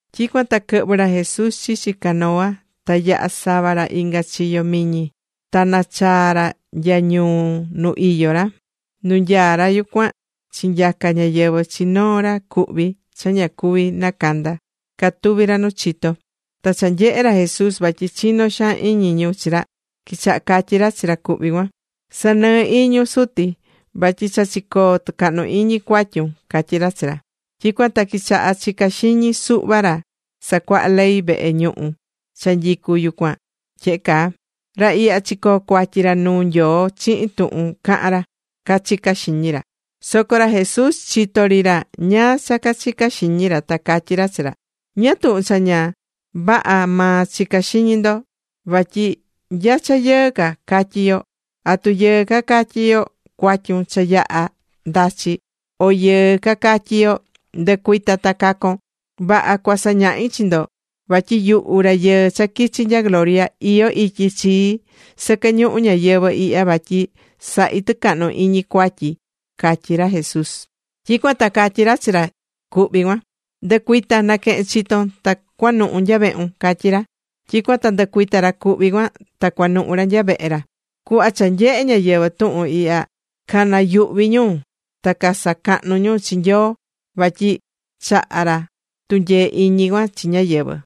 Tyicuan ta quɨhvɨ̱ ra Jesús chichi canoa ta yaha̱ sava ra inga chiyo miñi, ta nachaa̱ ra nya ñuu nu iyó ra. Nu nyaá ra yucuan chinyaca̱ ñáyɨvɨ chi noo ra cuhví cha ña cuví nacanda catuví ra nu chito. Ta cha nyehe̱ ra Jesús vatyi chinó xaan iñi ñu chi ra, quichaha catyí ra chi ra cuhví cuan: ―Sa̱nɨɨ iñun, suti vatyi cha chicoo̱ tɨcahnu iñi cuatyun ―catyí ra chi ra. Tyicuan ta quichaha̱ chica xiñi suhva ra sacuahá ley vehe ñuhu cha nyicú yucuan tyehe caa: “Ra ihya chicoo̱ cuatyi ra nu Nyoo chihin tuhun cahán ra”, cachicá xiñi ra. Soco ra Jesús chitó ri ra ñáá cha cachicá xiñi ra, ta catyí ra chi ra: ―¿Ñáá tuhun cha ña vaha maa chicá xiñi ndo? Vatyi ¿nya cha yɨɨ ca catyí yo: atu yɨɨ ca catyí yo “Cuatyun cha yaha ndachi”, o yɨɨ ca catyi yo: “Ndɨ̱cuita ta ca̱con”? Vaha. Cuasañahi chi ndo vatyi yuhu Rayɨɨ cha quichi nya gloria, iyó ityi chii sɨquɨ ñuhu ñayɨvɨ̱ ihya vatyi sahi tɨcahnu iñi cuatyi ―catyí ra Jesús. Tyicuan ta catyí ra chi ra cuhví cuan: ―Ndɨ̱cuita, na̱quehen chiton ta cua̱nuhu nya vehun ―catyí ra. Tyicuan ta ndɨcuita̱ ra cuhví cuan ta cuanuhu̱ ra nya vehe ra. Cuhva cha nyehe̱ ñáyɨvɨ tuhun ihya, canayuhví ñu. Ta casacahnú ñu chi Nyoo vatyi chaha̱ ra tunyee iñi cuan chi ñáyɨvɨ.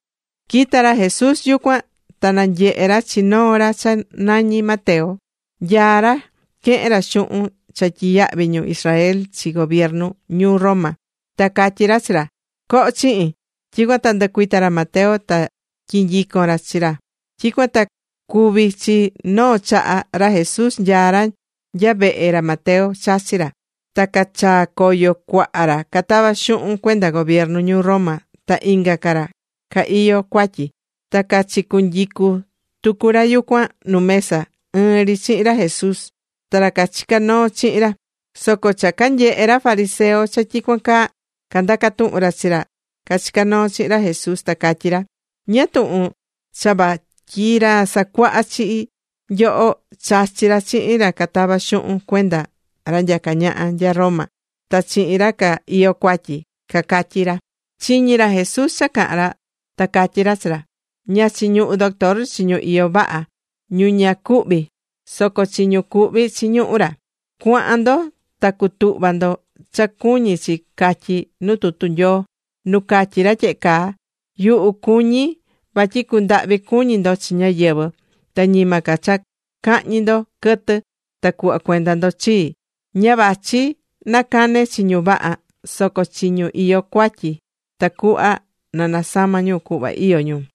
Quita̱ ra Jesús yucuan, ta nanyehe̱ ra chi noo ra cha nañí Mateo, nyaá ra quehen ra xuhun cha tyiyahví ñu Israel chi gobiernu ñuu Roma. Ta catyí ra chi ra: ―Co̱ho chihin. Tyicuan ta ndɨcuita̱ ra Mateo ta tyinyico̱n ra chi ra. Tyicuan ta cuvi̱ chi noo chaha ra Jesús nyaá ra nya vehe ra Mateo, chachí ra. Ta cachaa̱ coyo cuaha ra catavá xuhun cuenda gobiernu ñuu Roma ta inga ca ra ca iyó cuatyi. Ta cachicunyicú tucu ra yucuan nu mesa ɨɨn ri chihin ra Jesús ta ra cachicá noo chihin ra. Soco cha canyehe̱ ra fariseo cha tyicuan caa, candaca̱ tuhun ra chi ra cachicá noo chihin ra Jesús, ta cacatyí ra: ―¿Ñáá tuhun cha vatyi ra sacuahá chi nyoho chachí ra chihin ra catavá xuhun cuenda ra nyacá ñaha nya Roma ta chihin ra ca iyó cuatyi? ―cacatyí ra. Chiñi̱ ra Jesús cha caha̱n ra, ta catyí ra chi ra: ―Ña chiñuhú doctor chi ñu iyó vaha, ñu ña cuhví, soco chi ñu cuhví chiñuhú ra. Cua̱han ndo ta cu̱tuhva ndo cha cuñí chi catyi nu tutu Nyoo, nu catyí ra tyehe caa: “Yuhu cuñí vatyi cundahvi cuñi ndo chi ñáyɨvɨ, ta ñima ca cha cahñi ndo quɨtɨ ta cuhva cuenda ndo chii.” Ña vachi na cane chi ñu vaha, soco chi ñu iyó cuatyi, tacuhva na nasama ñu cuhva iyó ñu.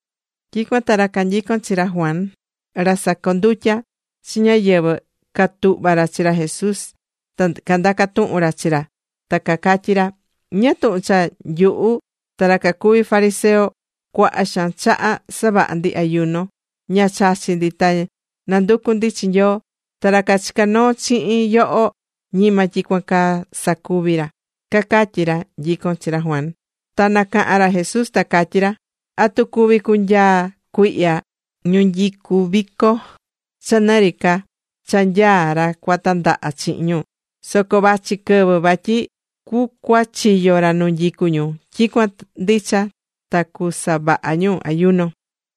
Tyicuan ta ra canyicón chi ra Juan, ra sacondutya chi ñáyɨvɨ, catuhva̱ ra chi ra Jesús ta candaca̱ tuhun ra chi ra ta cacatyí ra: ―¿Ñáá tuhun cha nyuhu ta ra cacuví fariseo, cuaha xaan chaha savaha ndi ayuno, ña chachí ndi ta nanducú ndi chi Nyoo? ¿Ta ra cachicá noo chihin yoho ñima tyicuan caa sacuvi ra? ―cacatyí ra nyicón chi ra Juan. Ta nacaha̱n ra Jesús ta catyí ra: ―¿Atu cuví cunyaa cuihya ñu nyicú vico cha nɨ ri ca cha nyaá ra cua tandaha chihin ñu? Soco vachi quɨvɨ vatyi cucuachiyo ra nu nyicú ñu, tyicuan ndicha ta cusavaha ñu ayuno.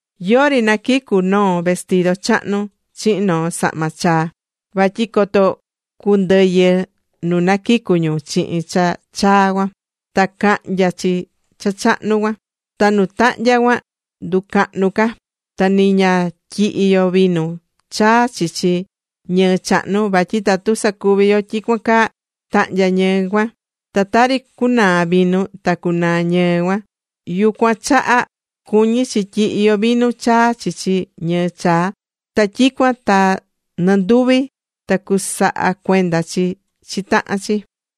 ’Yori naquicú noo vestido chahnu chihin noo sahma chaa vatyi coto cundɨyɨ nu naquicu̱ ñu chihin cha chaa cuan, ta cahnya chi cha chahnu cuan, ta nu tahnya cuan nducahnu ca. Ta ni ña tyihí yo vinu chaa chichi ñɨɨ chahnu vatyi tatu sacuvi yo tyicuan caa, tahnya ñɨɨ cuan, ta tari cunaa vinu, ta cunaa ñɨɨ cuan. Yucuan chaha cuñí chi tyihi yo vinu chaa chichi ñɨɨ chaa, ta tyicuan ta nɨnduvi ta cusaha cuenda chi chi tahan chi.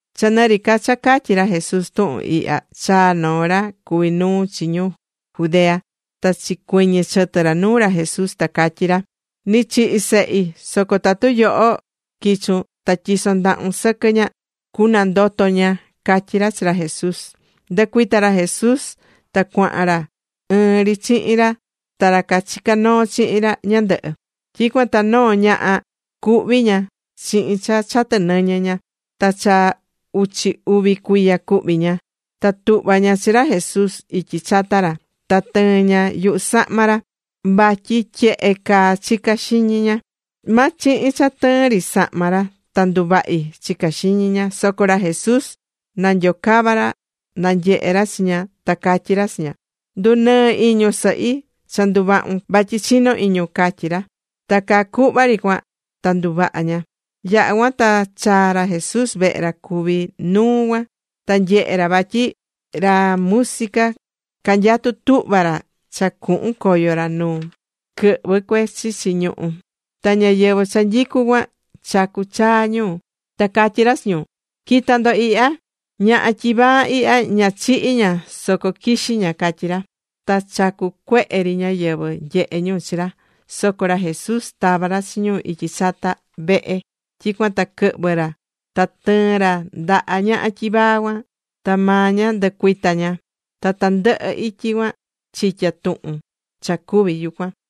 Cha nɨ ri ca cha catyí ra Jesús tuhun ihya, chaa̱ noo ra cuví nuu chi ñu Judea ta chicuiñi̱ chɨtɨ ra nuu ra Jesús, ta catyí ra: ―Ni chihi̱ sehi, soco tatu yoho quichun ta tyison ndahun sɨquɨ ña, cunandoto ña ―catyí ra chi ra Jesús. Ndɨcuita̱ ra Jesús ta cuahan ra ɨɨn ri chihin ra ta ra cachicá noo chihin ra ñandɨhɨ. Tyicuan ta noo ñaha, cuhví ña chihin cha chatɨ nɨñɨ ña. Ta cha uchi uvi cuiya cuhví ña. Ta tuhva̱ ña chi ra Jesús ityi chata ra, ta tɨɨ̱n ña yuhu sahma ra, vatyi tyehe caa chicá xiñi ña: “Ma chihin cha tɨɨn ri sahma ra ta nduvahi”, chicá xiñi ña. Soco ra Jesús nanyocava̱ ra nanyehe ra chi ña, ta catyi ra chi ña: ―Ndunɨɨ iñun sɨhi, cha nduvahu̱n vatyi chinó iñun ―catyí ra. Ta caa cuhva ri cuan ta nduvaha̱ ña. Yaha̱ cuan ta chaa̱ ra Jesús vehe ra cuví nuu cuan, ta nyehe̱ ra vatyi ra música canyatú tuhva ra cha cuhun coyo ra nu quɨhvɨ cue chichi ñuhú. Ta ñáyɨvɨ cha nyicú cuan chacú chaa ñu. Ta catyí ra chi ñu: ―Qui̱ta ndo ihya. Ñaha tyivaa ihya, ña chihi̱ ña, soco quixí ña ―catyí ra. Ta chacú cuehe ri ñáyɨvɨ nyehe ñu chi ra. Soco ra Jesús tava̱ ra chi ñu ityi chata vehe, tyicuan ta quɨhvɨ̱ ra ta tɨɨ̱n ra ndaha ñaha tyivaa cuan, ta maa ña ndɨcuita̱ ña. Ta tandɨhɨ ityi cuan chitya̱ tuhun cha cuvi̱ yucuan.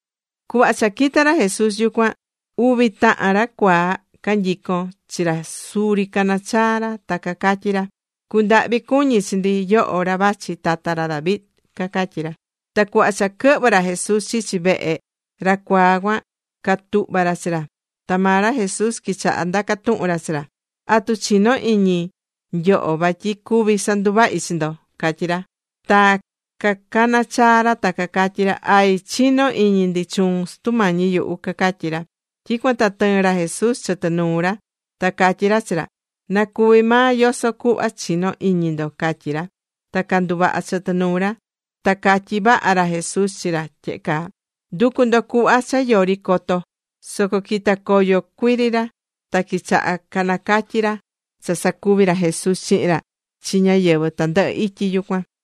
Cuhva cha quita̱ ra Jesús yucuan, uvi tahan ra cuaa canyicón chi ra suri caná chaa ra ta cacatyí ra: ―¡Cu̱ndahvi cuñi chi ndi, yoho ra vachi tata ra David! ―cacatyí ra. Ta cuhva cha quɨhvɨ̱ ra Jesús chichi vehe, ra cuaa cuan, catuhva̱ ra chi ra, ta maa ra Jesús quichaha ndaca̱ tuhun ra chi ra: ―¿Atu chinó iñi nyoho vatyi cuví sanduvahi chi ndo? ―catyí ra. Ta canacaha̱n ra ta catyí ra: ―Ay, chinó iñi ndi chuun, Sutu Mañi yuhu ―cacatyí ra. Tyicuan ta tɨɨ̱n ra Jesús chɨtɨ nuu ra ta catyí ra chi ra: ―Na cuvi maa yoso cuhva chinó iñi ndo ―catyí ra. Ta canduvaha̱ chɨtɨ nuu ra. Ta catyí vaha ra Jesús chi ra tyehe caa: ―Ndu̱cu ndo cuhva cha yori coto. Soco quita̱ coyo cuiri ra ta quichaha canacatyi̱ ra cha sacuvi̱ ra Jesús chihin ra chi ñáyɨvɨ tandɨhɨ ityi yucuan.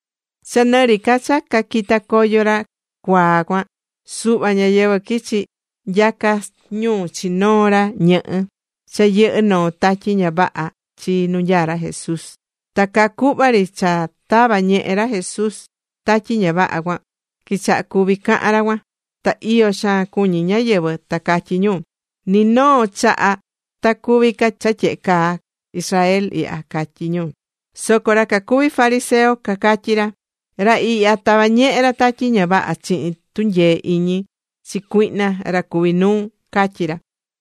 Cha nɨ ri ca cha caquita̱ coyo ra cucuaa cuan, suhva ñáyɨvɨ quichi̱ nyaca ñu chi noo ra ñɨhɨ́ cha yɨhɨ́ noo tatyi ña vaha chi nu nyaá ra Jesús. Ta caa cuhva ri cha tava̱ ñehe ra Jesús tatyi ña vaha cuan, quichaha̱ cuvi cahan ra cuan. Ta iyo xaan cuñí ñáyɨvɨ, ta catyí ñu: ―Ni noo chaha ta cuvi ca cha tyehe caa Israel Ihya ―catyí ñu. Soco ra cacuvi fariseo, cacatyí ra: ―Ra ihya tavá ñehe ra tatyi ña vaha chihin tunyee iñi chi cuihna ra cuví nuu ―catyí ra.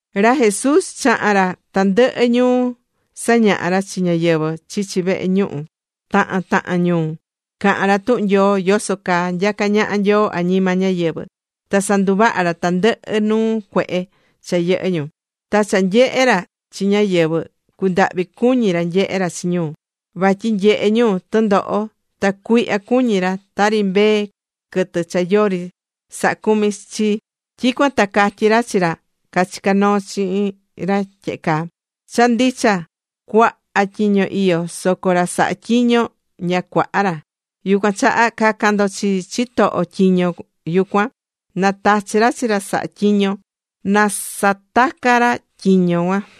Ra Jesús chaha̱n ra tandɨhɨ ñuu sañahá ra chi ñáyɨvɨ chichi vehe ñuhu tahan tahan ñuu. Cahán ra tuhun Nyoo yoso caa nyacá ñaha Nyoo añima ñáyɨvɨ. Ta sanduvahá ra tandɨhɨ nuu cuehe cha yɨhɨ́ ñu. Ta cha nanyehé ra chi ñáyɨvɨ, cundahvi cuñí ra nyehé ra chi ñu, vatyi nyehé ñu tɨndoho ta cuihya cuñí ñu, tari mbee quɨtɨ cha yori sahá cumi chi. Tyicuan ta catyí ra chi ra cachicá noo chihin ra tyehe caa: ―Cha ndicha, cuaha tyiño iyó, soco ra sahá tyiño, ña cuaha ra. Yucuan chaha, ca̱can ndo chi chitoho tyiño yucuan, na tachi ra chi ra saha tyiño na sataca ra tyiño cuan.